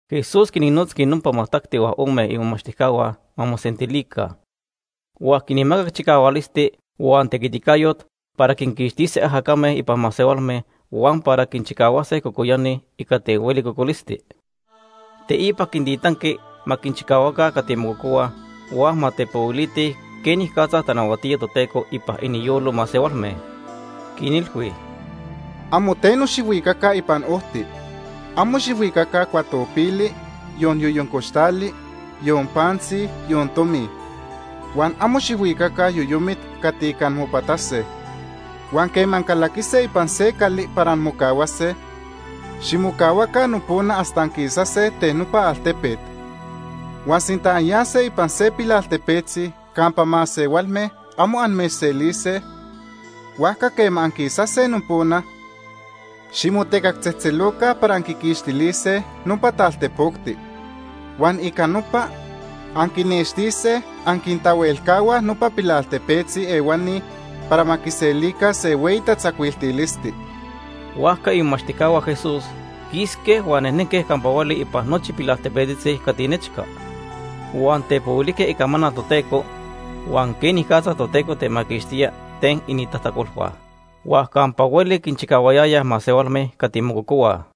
Jesús quinnotzqui nopa majtacti huan ome imomachtijcahua ma mosentilica, huan quinmacac chicahualisti huan tequiticayot para quinquixtise ajacame ipan masehualme huan para quinchicahuase cocoyani ica ten hueli cocolisti. Teipa quintitanqui ma quinchicahuaca cati mococohuaj huan ma tepohuilitij quenicatza tanahuatía Toteco ipan iniyolo masehualme. Quinilhui: ―Amo teno xijhuicaca ipan ojti. Amo xijhuicaca cuatopili, yon yoyoncoxtali, yon pantzi, yon tomi. Huan amo xijhuicaca yoyomit cati ica anmopatase. Huan quema ancalaquise ipan se cali para anmocahuase, ximocahuaca nopona hasta anquisase ten nopa altepet. Huan sinta anyase ipan se pilaltepetzi campa masehualme amo amechselise, huajca quema anquisase nopona, ximotecactzejtzeloca para anquiquixtilise nopa taltepocti. Huan ica nopa, anquinnextise anquintahuelcahuaj nopa pilaltepetzi ehuani para ma quiselica se hueyi tatzacuiltilisti. Huajca imomachtijcahua Jesús quisque huan nejnenque campa hueli ipan nochi pilaltepetzi cati nechca. Huan tepohuilijque icamanal Toteco huan quenicatza Toteco temaquixtía ten inintajtacolhua. Huan campa hueli quinchicahuayayaj masehualme cati mococohuaj.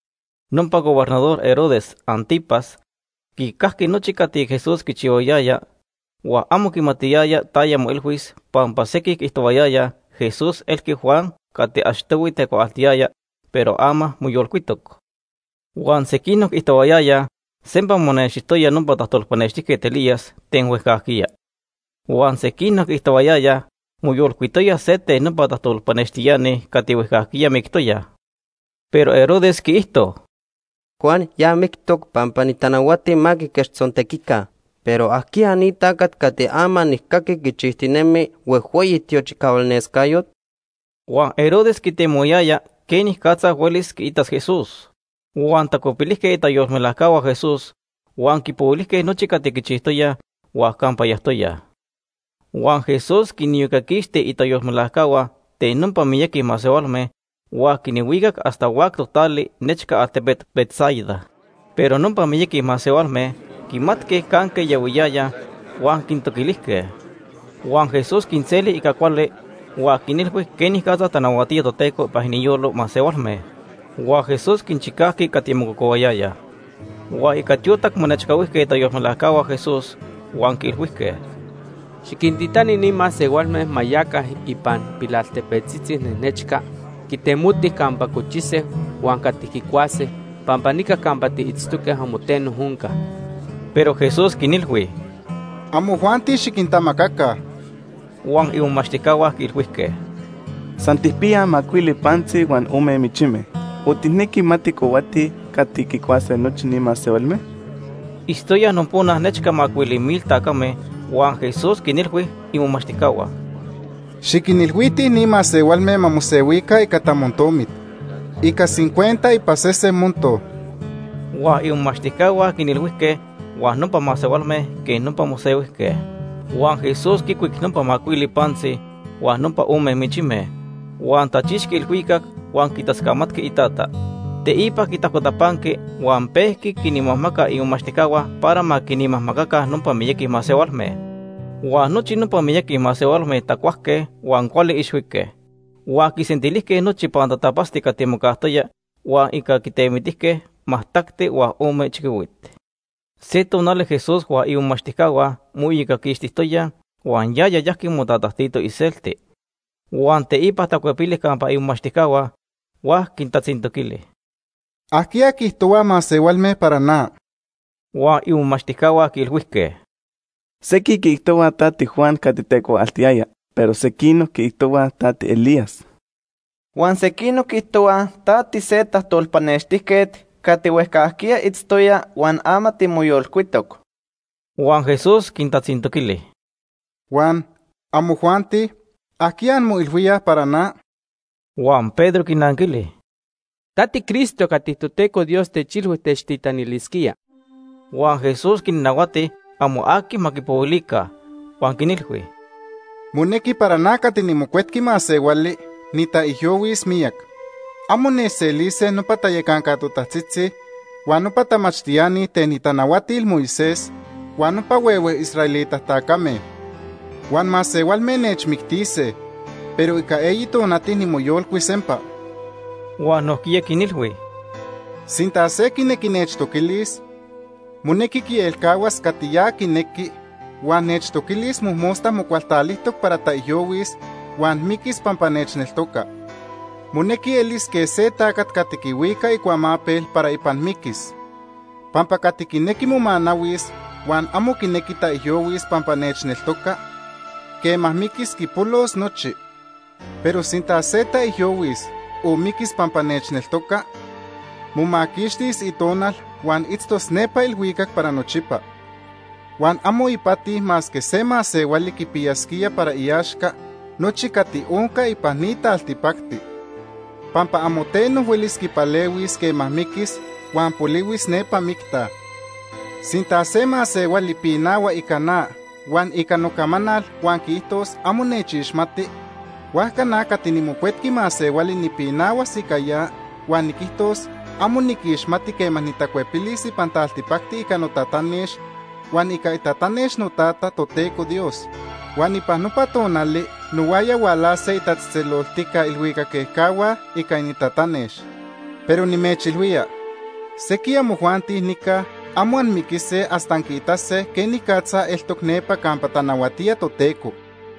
Nopa Gobernador Herodes Ántipas quicajqui nochi cati Jesús quichihuayaya, huan amo quimatiyaya taya moilhuis pampa sequij quiijtohuayayaj Jesús elqui Juan cati achtohui tecuaaltiyaya pero ama moyolcuitoc. Huan sequinoc quiijtohuayayaj sempa monextijtoya nopa tajtolpanextijquet Elías ten huejcajquiya. Huan sequinoc quiijtohuayayaj moyolcuitoya se ten nopa tajtolpanextiani cati huejcajquiya mictoyaj. Pero Herodes quiijto: ―Juan ya mictoc pampa nitanahuati ma quiquechtzontequica, pero ¿ajquiya ni tacat cati ama nijcaqui quichijtinemi huejhueyi tiochicahualnescayot? Huan Herodes quitemohuayaya quenicatza huelis quiitas Jesús. Huan tacuepilijque itayolmelajcahua Jesús, huan quipohuilijque nochi cati quichijtoyaj huan campa yajtoyaj. Huan Jesús quiniyocaquixti itayolmelajcahua ten nopa miyaqui masehualme huan quinhuicac hasta huactoc tali nechca altepet Betsaida. Pero nopa miyaqui masehualme quimatque canque yahuiyayaj huan quintoquilijque. Huan Jesús quinseli ica cuali huan quinilhui quenicatza tanahuatía Toteco ipan iniyolo masehualme. Huan Jesús quinchicajqui cati mococohuayayaj. Huan ica tiotac monechcahuijque itayolmelajcahua Jesús huan quiilhuijque: ―Xiquintitani ni masehualme ma yaca ipan pilaltepetzi nechca quitemotij campa cochise huan cati quicuase pampa nica campa tiitztoque amo teno onca. Pero Jesús quinilhui: ―Amojuanti xiquintamacaca. Huan imomachtijcahua quiilhuijque: ―San tijpiyaj macuili pantzi huan ome michime, o ¿tijnequi ma tijcohuatij cati quicuase nochi ni masehualme? Itztoyaj nopona nechca macuili mil tacame huan Jesús quinilhui imomachtijcahua: ―Xiquinilhuitij ni masehualme ma mosehuica ica tamontomit, ica cincuenta ipan sese monto. Huan imomachtijcahua quinilhuijque huan nopa masehualme quej nopa mosehuijque. Huan Jesús quicuic nopa macuili pantzi huan nopa ome michime, huan tachixqui ilhuicac huan quitascamatqui iTata. Teipa quintajcotapanqui huan pejqui quinmajmaca imomachtijcahua para ma quinmajmacaca nopa miyaqui masehualme. Huan nochi nopa miyaqui masehualme tacuajque huan cuali ixhuique. Huan quisentilijque nochi pantatapatzti cati mocajtoya huan ica quitemitijque majtacti huan ome chiquihuit. Se tonali Jesús huan imomachtijcahua moiyocaquixtijtoyaj huan yaya yajqui motatajtito iselti. Huan teipa tacuepili campa imomachtijcahua huan quintatzintoquili: ―¿Ajquiya quiijtohuaj masehualme para na? Huan imomachtijcahua quiilhuijque: ―Sequij quiijtohuaj ta tiJuan cati tecuaaltiyaya, pero sequinoc quiijtohuaj ta tiElías. Huan sequinoc quiijtohuaj ta tise tajtolpanextijquet cati huejcajquiya itztoya huan ama timoyolcuitoc. Huan Jesús quintatzintoquili: ―Huan, ¿amojuanti? ¿Ajquiya anmoilhuíaj para na? Huan Pedro quinanquili: ―Ta tiCristo cati Toteco Dios techilhui techtitanilisquía. Huan Jesús quinnahuati amo aqui ma quipohuilica, huan quinilhui: ―Monequi para na cati niMocuetqui Masehuali nitaijyohuis miyac. Amo nechselise nopa tayacanca totajtzitzi, huan nopa tamachtiani ten itanahuatil Moisés, huan nopa huehue israelita tacame. Huan masehualme nechmictise, pero ica eyi tonati nimoyolcuis sempa. Huan nojquiya quinilhui: ―Sinta se quinequi nechtoquilis, monequi quielcahuas cati ya quinequi huan nechtoquilis mojmosta mocualtalijtoc para taijyohuis huan miquis pampa nechneltoca. Monequi elis quej se tacat cati quihuica icuamapel para ipan miquis. Pampa cati quinequi momanahuis huan amo quinequi taijyohuis pampa nechneltoca, quema miquis quipolos nochi. Pero sinta se taijyohuis o miquis pampa nechneltoca, momaquixtis itonal huan itztos nepa ilhuicac para nochipa. Huan amo ipati masque se masehuali quipiyasquía para iaxca nochi cati onca ipan ni taltipacti, pampa amo teno huelis quipalehuis quema miquis huan polihuis nepa micta. Sinta se masehuali pinahua ica na huan ica nocamanal huan quiijtos amo nechixmati, huajca na cati niMocuetqui Masehuali nipinahuas ica ya huan niquijtos amo niquixmati quema nitacuepilis ipan taltipacti ica notatanex, huan ica itatanex noTata, Toteco Dios. Huan ipan nopa tonali nohuaya hualase itatzejtzeloltica ilhuicac ejcahua ica inintatanex. Pero nimechilhuía, sequij amojuanti nica amo anmiquise hasta anquiitase quenicatza eltoc nepa campa tanahuatía Toteco.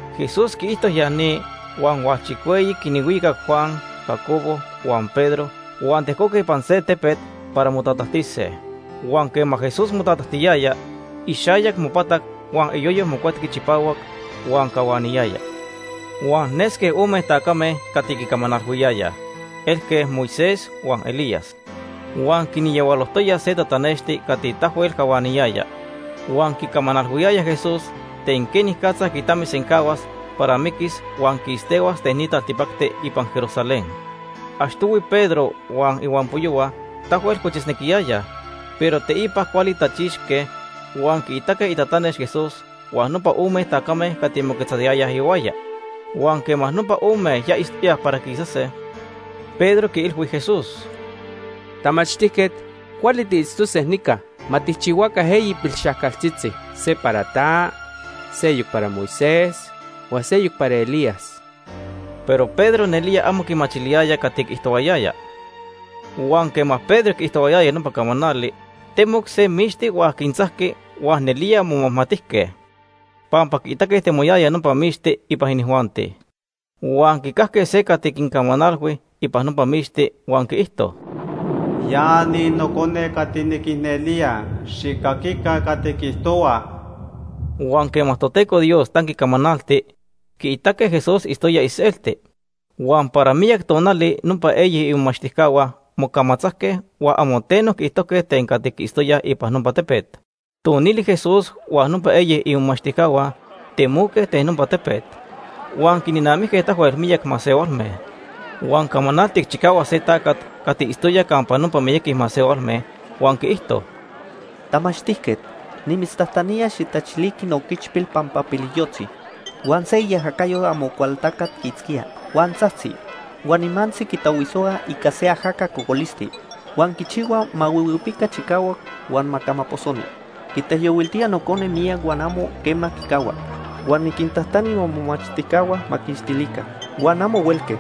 Jesús quiijto ya ni huan hualchicueyi quinhuicac Juan, Jacobo huan Pedro huan tejcoque ipan se tepet para motatajtise. Huan quema Jesús motatajtiyaya, ixayac mopatac huan iyoyo mocuetqui chipahuac huan cahuaniyaya. Huan nesque ome tacame cati quicamanalhuiyayaj. Elque Moisés huan Elías. Huan quinyahualojtoya se tatanexti cati tahuel cahuaniyaya. Huan quicamanalhuiyayaj Jesús ten quenicatza quitamisencahuas para miquis huan quistehuas ten ni taltipacti ipan Jerusalén. Achtohui Pedro huan ihuampoyohua tahuel cochisnequiyayaj, pero teipa cuali tachixque huan quiitaque itatanex Jesús huan nopa ome tacame cati moquetzayayaj ihuaya. Huan quema nopa ome ya itztoyaj para quisase, Pedro quiilhui Jesús: ―Tamachtijquet, cuali tiitztose nica. Ma tijchihuaca eyi pilxajcaltzitzi. Se para ta, seyoc para Moisés, huan seyoc para Elías. Pero Pedro nelía amo quimachiliyaya cati quiijtohuayaya. Huan quema Pedro quiijtohuayaya nopa camanali, temoc se mixti huan quintzajqui huan nelía momajmatijque, pampa quiitaque temoyaya nopa mixti ipan inijuanti. Huan quicajque se cati quincamanalhui ipan nopa mixti huan quiijto: “Ya ni Nocone cati niquicnelía. Xijcaquica cati quiijtohua.” Huan quema Toteco Dios tanqui camanalti, quiitaque Jesús itztoya iselti. Huan para miyac tonali nopa eyi imomachtijcahua mocamatzajque huan amo teno quiijtojque ten cati quiitztoyaj ipan nopa tepet. Tonili Jesús huan nopa eyi imomachtijcahua temoque ten nopa tepet, huan quinnamijque tahuel miyaqui masehualme. Huan camanaltic chicahuac se tacat cati itztoya campa nopa miyaqui masehualme huan quiijto: ―Tamachtijquet, nimitztajtanía xijtachiliqui nooquichpil pampa piliyojtzi. Huan se iajacayo Amocualtacat quiitzquía, huan tzajtzi, huan nimantzi quitahuisohua ica se ajaca cocolisti, huan quichihua ma huihuipica chicahuac huan ma camaposoni. Quitaijyohuiltía nocone miyac huan amo quema quicahua. Huan niquintajtani momomachtijcahua ma quiquixtilica, huan amo huelque.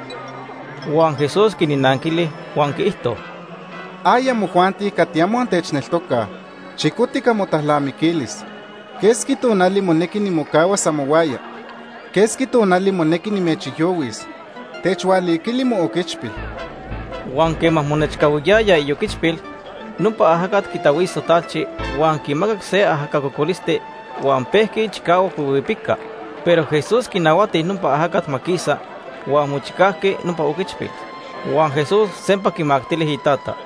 Huan Jesús quinanquili huan quiijto: ―¡Ay amojuanti cati amo antechneltocaj! Chicotic amotalnamiquilis. ¿Quesqui tonali monequi nimocahuas amohuaya? ¿Quesqui tonali monequi nimechijyohuis? Techhualiquili mooquichpil. Huan quema monechcahuiyaya ioquichpil, nopa ajacat quitahuiso talchi huan quimacac se ajaca cocolisti, huan pejqui chicahuac huihuipica. Pero Jesús quinahuati nopa ajacat ma quisa huan mochicajqui nopa oquichpil. Huan Jesús sempa quimactili itata.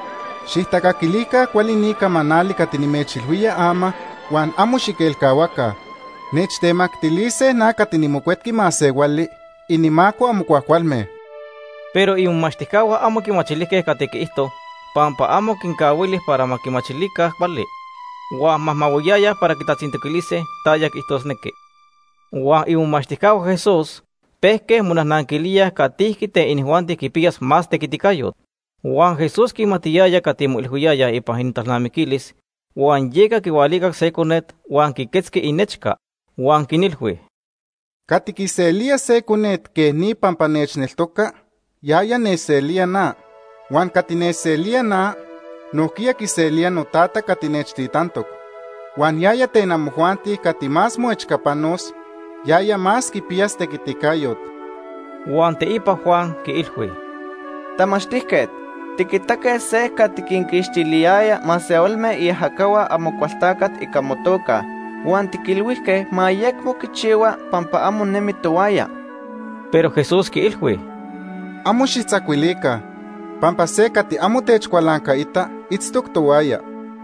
―Xijtacaquilica cuali ni camanali cati nimechilhuía ama huan amo xiquelcahuaca. Nechtemactilise na cati niMocuetqui Masehuali inimaco amo cuajcualme. Pero imomachtijcahua amo quimachilijque cati quiijto pampa amo quincahuili para ma quimachilica cuali, huan majmahuiyayaj para quitatzintoquilise taya quiijtosnequi. Huan imomachtijcahua Jesús pejque monajnanquilíaj catijqui ten inijuanti quipiyas más tequiticayot. Huan Jesús quimatiyaya cati moilhuiyayaj ipan inintalnamiquilis, huan yeca quihualicac se conet huan quiquetzqui inechca. Huan quinilhui: ―Cati quiselía se conet quej ni pampa nechneltoca, yaya nechselía na. Huan cati nechselía na, nojquiya quiselía noTata cati nechtitantoc. Huan yaya ten amojuanti cati más moechcapanos, yaya más quipiyas tequiticayot. Huan teipa Juan quiilhui: ―Tamachtijquet, tiquitaque se cati quinquixtiliyaya masehualme iajacahua Amocualtacat ica motoca O quiijtohuayayaj para quipixtoyaj motequiticayo., huan tiquilhuijque ma ayecmo quichihua pampa amo nemi tohuaya. Pero Jesús quiilhui: ―Amo xijtzacuilica pampa se cati amo techcualancaita itztoc tohuaya.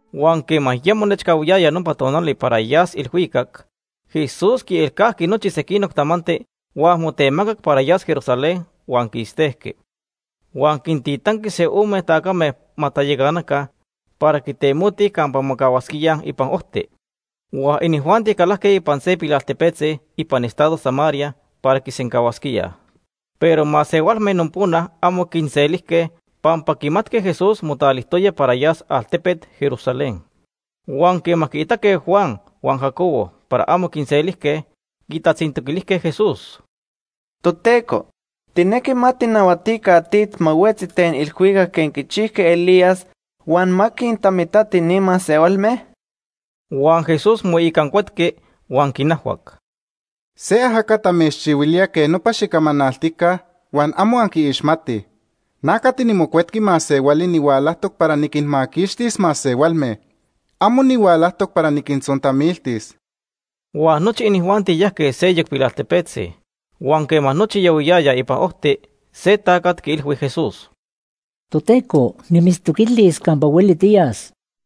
Huan quema ya monechcahuiyaya nopa tonali para yas ilhuicac, Jesús quielcajqui nochi sequinoc tamanti huan motemacac para yas Jerusalén huan quistejqui. Huan quintitanqui se ome tacame ma tayacanaca para quitemotij campa mocahuasquíaj ipan ojti. Huan inijuanti calajque se pilaltepetzi ipan estado Samaria para quisencahuasquíaj. Pero masehualme nopona amo quinselijque pampa quimatque Jesús motalijtoya para yas altepet Jerusalén. Huan quema quiitaque Juan huan Jacobo para amo quinselijque, quitatzintoquilijque Jesús: ―Toteco, ¿tijnequi ma tijnahuatica tit ma huetzi ten ilhuicac quej quichijqui Elías huan ma quintamitati ni masehualme? Huan Jesús moicancuetqui huan quinajhuac: ―Se ajacat amechchihuilía quej nopa xicamanaltica huan amo anquiixmatij. Na cati niMocuetqui Masehuali nihualajtoc para niquinmaquixtis masehualme. Amo nihualajtoc para niquintzontamiltis. Huan nochi inijuanti yajque seyoc pilaltepetzi. Huan quema nochi yahuiyayaj ipan ojti, se tacat quiilhui Jesús: ―Toteco, nimitztoquilis campa hueli tiyas.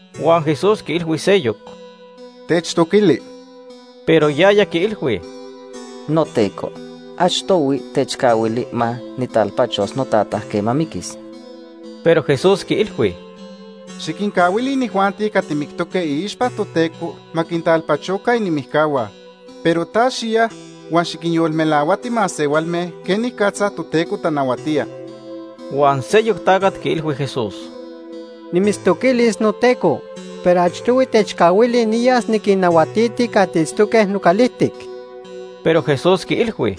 Huan Jesús quiilhui seyoc: ―Techtoquili. Pero yaya quiilhui: ―NoTeco, achtohui techcahuili ma nijtalpachos notata quema miquis. Pero Jesús quiilhui: ―Xiquincahuili inijuanti cati mictoque iixpa Toteco ma quintalpachoca inimijcahua. Pero ta xiya huan xiquinyolmelahuati masehualme quenicatza Toteco tanahuatía. Huan seyoc tacat quiilhui Jesús: ―Nimitztoquilis, noTeco, pero achtohui techcahuili niyas niquinnahuatiti cati itztoque nocalijtic. Pero Jesús quiilhui: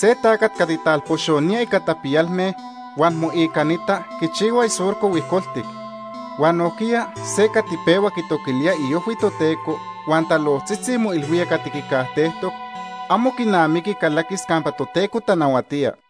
―Se tacat cati talpoxonía ica tapiyalme huan moicanita quichihua isurco huijcoltic, huan nojquiya se cati pehua quitoquilía iojhui Toteco huan talojtzitzi moilhuía cati quicajtejtoc, amo quinamiqui calaquis campa Toteco tanahuatía.